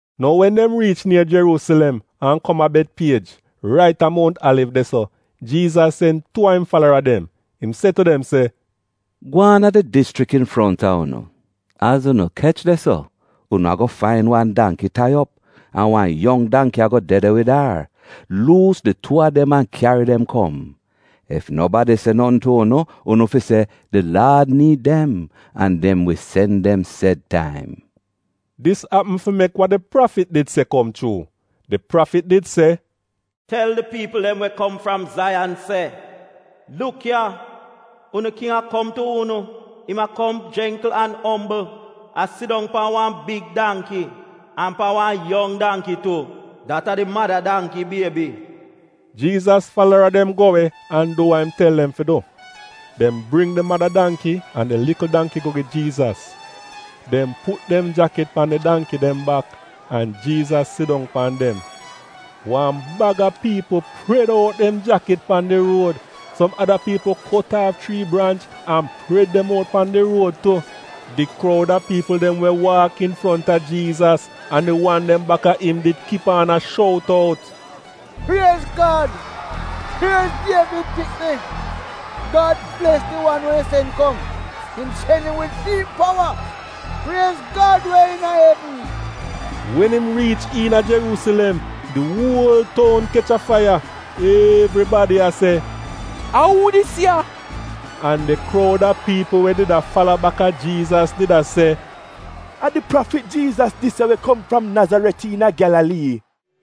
Nou wen dem riich nier Jeruusilem an kom a Betpiej, rait a Mount Aliv de-so, Jiizas sen tuu a im falara dem, im se tu dem se, “Gwaan a di dischrik infronta unu, az unu kech de-so unu ago fain wan dangki tai op, an wan yong dangki ago de de wid ar. Luus di tuu a dem an kyari dem kom. Ef nobadi se notn tu unu, unu fi se, ‘Di Laad niid dem,’ an dem wi sen dem sed taim.” Dis apm fi mek wa di prafit did se kom chuu. Di prafit did se, “Tel di piipl dem we kom fram Zaiyan se, ‘Luk ya, unu king a kom tu unu, im a kom jengkl an ombl, a sidong pan wan big dangki, an pan wan yong dangki tu — dat a di mada dangki biebi.’” Jiizas falara dem go we go du wa im tel dem fi du. Dem bring di mada dangki an di likl dangki go gi Jiizas. Dem put dem jakit pan di dangki dem bak, an Jiizas sidong pan dem. Wan baga piipl pred out dem jakit pan di ruod. Som ada piipl kot aaf chrii branch an pred dem out pan di ruod tu. Di kroud a piipl dem we waak infronta Jiizas, an di wan dem baka im did kip aan a shout out, “Priez Gad! Priez Dievid pikni!” “Gad bles di wan we im sen kom — im sen im wid fi'im powa!” “Priez Gad we iina evn!” Wen im riich iina Jeruusilem di uol toun kech a faiya, evribadi a se, “A uu dis ya?” An di kroud a piipl dem we did a fala baka Jiizas did a se, “A di prafit Jiizas dis ya we Kom fram Nazaret iina Gyalalii.”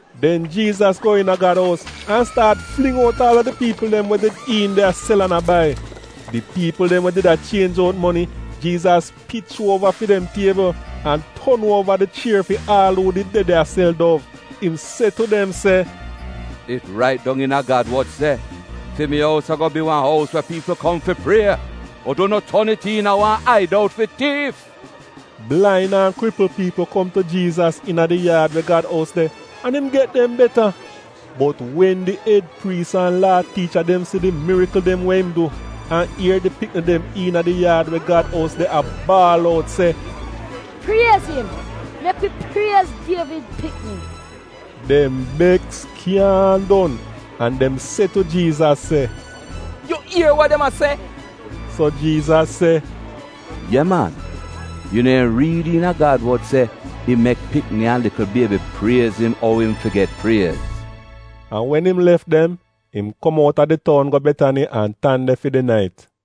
Den Jiizas go iina Gad ous an staat fling out aal a di piipl dem we did iin de a sel an a bai. Di piipl dem we did a chienj out moni, Jiizas pich uova fi dem tiebl, an ton uova di chier fi aal uu did de de a sel dov. Im se tu dem se, “It rait dong iina Gad wod se, ‘Fi mi ous ago bi wan ous we piipl kom fi prie,’ bot unu ton it iina wan aidout fi tiif’!” Blain an kripl piipl kom tu Jiizas iina di yaad we Gad ous de, an im get dem beta. Bot wen di ed priis an Laa tiicha dem si di mirikl dem we im du, an ier di pikni dem iina di yaad we Gad ous de a baal out se, “Priez im! Mek wi priez Dievid pikni” dem beks kyaahn don, an dem se tu Jiizas se, “Yu ier wa dem a se?” So Jiizas se, “Ye man. Yu neehn riid iina Gad wod se, ‘Im mek pikni an likl biebi priez im ou im fi get priez’?” An wen im lef dem, im kom outa di toun go Betani an tan de fi di nait.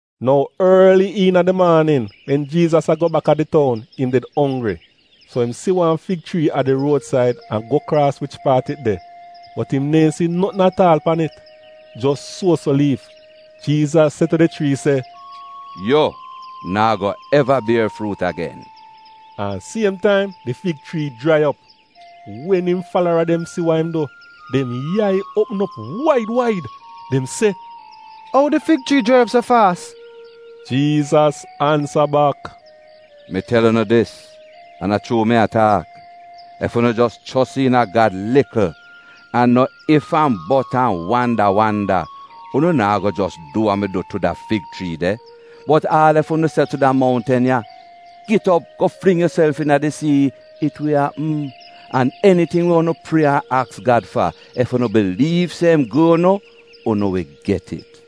Nou orli iina di maanin, wen Jiizas a go bak a di toun, im did onggri. So im si wan fig chrii a di ruodsaid an go kraas wich paat it de, bot im neehn si notn at aal pan it, jos suo-so liif. Jiizas se tu di chrii se, “Yu naa go eva bier fruut agen!” an siem taim di fig chrii jrai op. Wen im falara dem si wa im du, dem yai uopm op waid waid. Dem se, “Ou di fig chrii jrai op so faas?” Jiizas ansa bak, “Mi tel unu dis, an a chuu mi a taak, ef unu jos chos iina Gad likl, an no if-an-bot an wanda wanda, unu naa go jos du wa mi du tu da fig chrii de, bot aal ef unu se tu da moutn ya, ‘Git op go fling yuself iina di sii, it wi apm. An eniting we unu prie an aks Gad fa, ef unu biliiv se im gu'unu, unu wi get it.”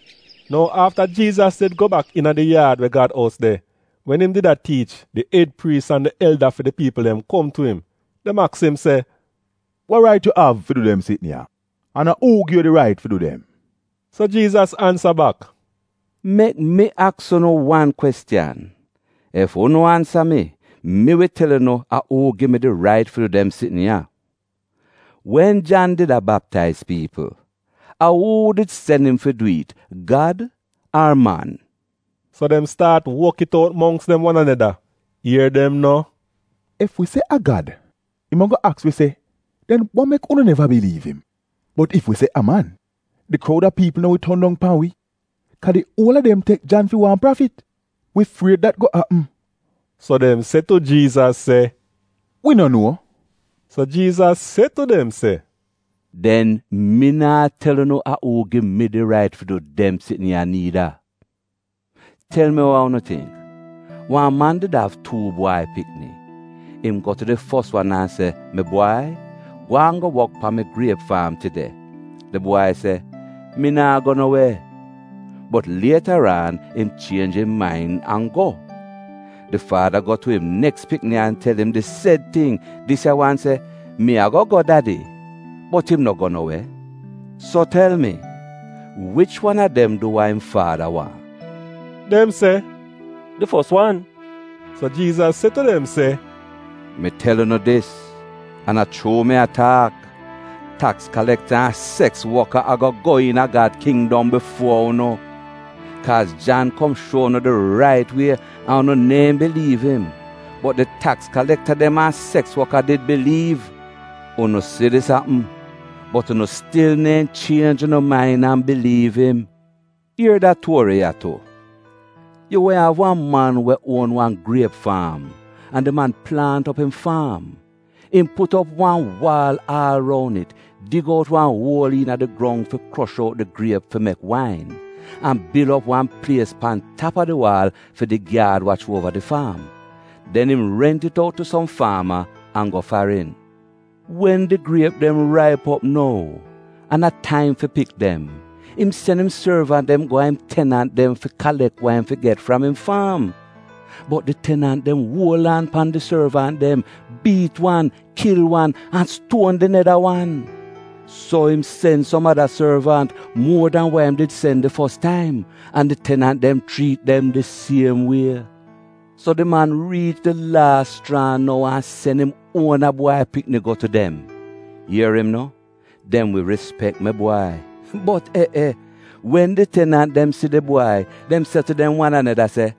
Nou afta Jiizas did go bak iina di yaad we Gad ous de, wen im did a tiich, di ed priis an di elda fi di piipl dem kom tu im. Dem aks im se, “Wa rait yu av fi du dem sitn ya, an a uu gi yu di rait fi du dem?” So Jiizas ansa bak, “Mek mi aks unu wan kwestiyan. Ef unu ansa mi, mi wi tel unu a uu gi mi di rait fi du dem sitn ya. Wen Jan did a baptaiz piipl, a uu did sen im fi dwi'it, Gad ar man?” So dem staat wok it out mongks dem wan aneda. Ier dem no, “Ef wi se, ‘A Gad’, im ago aks wi se, ‘Den wa mek unu neva biliiv im?’ Bot ef wi se, ‘A man’, di kroud a piipl no wi ton dong pan wi, kaa di uol a dem tek Jan fi wan prafit — wi fried dat go apm.” So dem se tu Jiizas se, “Wi no nuo,” So Jiizas se tu dem se, “Den mi naa tel unu a uu gi mi di rait fi du dem sitn ya niida. “Tel mi wa unu tingk? Wan man did av tuu bwai pikni. Im go tu di fos wan an se, ‘Mi bwai, gwaan go wok pan mi griep faam tide.’ “Di bwai se, ‘Mi naa go no we.’ Bot lietaraan im chienj im main an go. “Di Faada go tu im neks pikni an tel im di sed ting. Dis ya wan se, ‘Mi ago go dadi,’ bot im no go no we. “So tel mi, wich wan a dem du wa im faada waahn?” Dem se, “Di fos wan.” So Jiizas se tu dem se, “Mi tel unu dis, an a chuu mi a taak, taks kalekta an seks woka ago go iina Gad kindom bifuo unu! Kaaz Jan kom shuo unu di rait wie, an unu neehn biliiv im. Bot di taks kalekta dem an seks woka did biliiv. Unu si dis apm, bot unu stil neehn chienj unu main an biliiv im. “Ier da tuori ya tu: Yu wehn av wan man we uon wan griep faam an di man plaant op im faam. Im put op wan waal aal roun it, dig out wan uol iina di grong fi krosh out di griep fi mek wain, an bil op wan plies pan tap a di waal fi di gyaad wach uova di faam. Den im rent it out tu som faama an go farin. Wen di griep dem raip op nou, an a taim fi pik dem, im sen im sorvant dem go a im tenant dem fi kalek wa im fi get fram im faam. “Bot di tenant dem uol aan pan di sorvant dem, biit wan, kil wan, an stuon di neda wan. So im sen som ada sorvant, muo dan wa im did sen di fos taim. An di tenant dem chriit dem di siem wie. So di man riich di laas schraa nou an sen im uona bwai pikni go tu dem. Ier im no, ‘Dem wi rispek mi bwai.’ “Bot eh eh, wen di tenant dem si di bwai, dem se tu dem wan aneda se,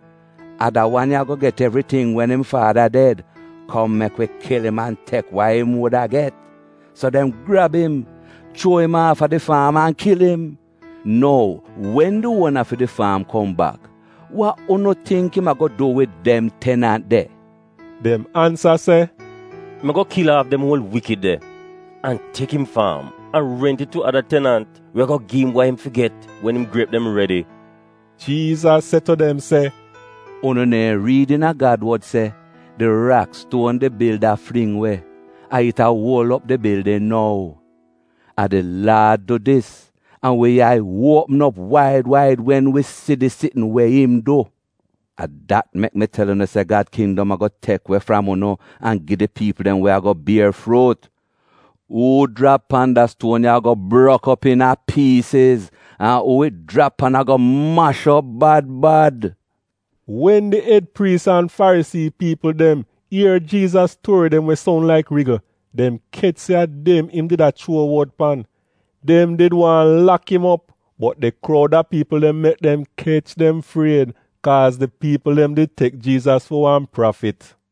‘A da wan ya ago get evriting wen im faada ded. Kom mek wi kil im an tek wa im wuda get.’ So dem grab im, chuo im aafa di faam an kil im. “Nou wen di uona fi di faam kom bak, wa unu tingk im ago du wid dem tenant de?” Dem ansa se, “Im ago kil aaf dem uol wikid de! An tek im faam an rent it tu ada tenant we ago gi'im wa im fi get wen im griep dem redi.” Jiizas se tu dem se, “Unu neehn riid iina Gad wod se: “‘Di rakstuon di bilda fling we, a it a uol op di bildin nou. A di Laad du dis, an wi yai uopm op waid waid wen wi si di sitn we im du’? “A dat mek mi tel unu se Gad kindom ago tek we fram unu an gi di piipl dem we ago bier fruut. Uu jrap pan da stuon ya ago brok op iina piisiz, an uu it jrap pan ago mash op bad bad.” Wen di ed priis an Farisii piipl dem ier Jiizas tuori dem we soun laik rigl, dem kech se a dem im did a chuo wod pan. Dem did waahn lak im op, bot di kroud a piipl dem mek dem kech dem fried. Kaaz di piipl dem did tek Jiizas fi wan prafit.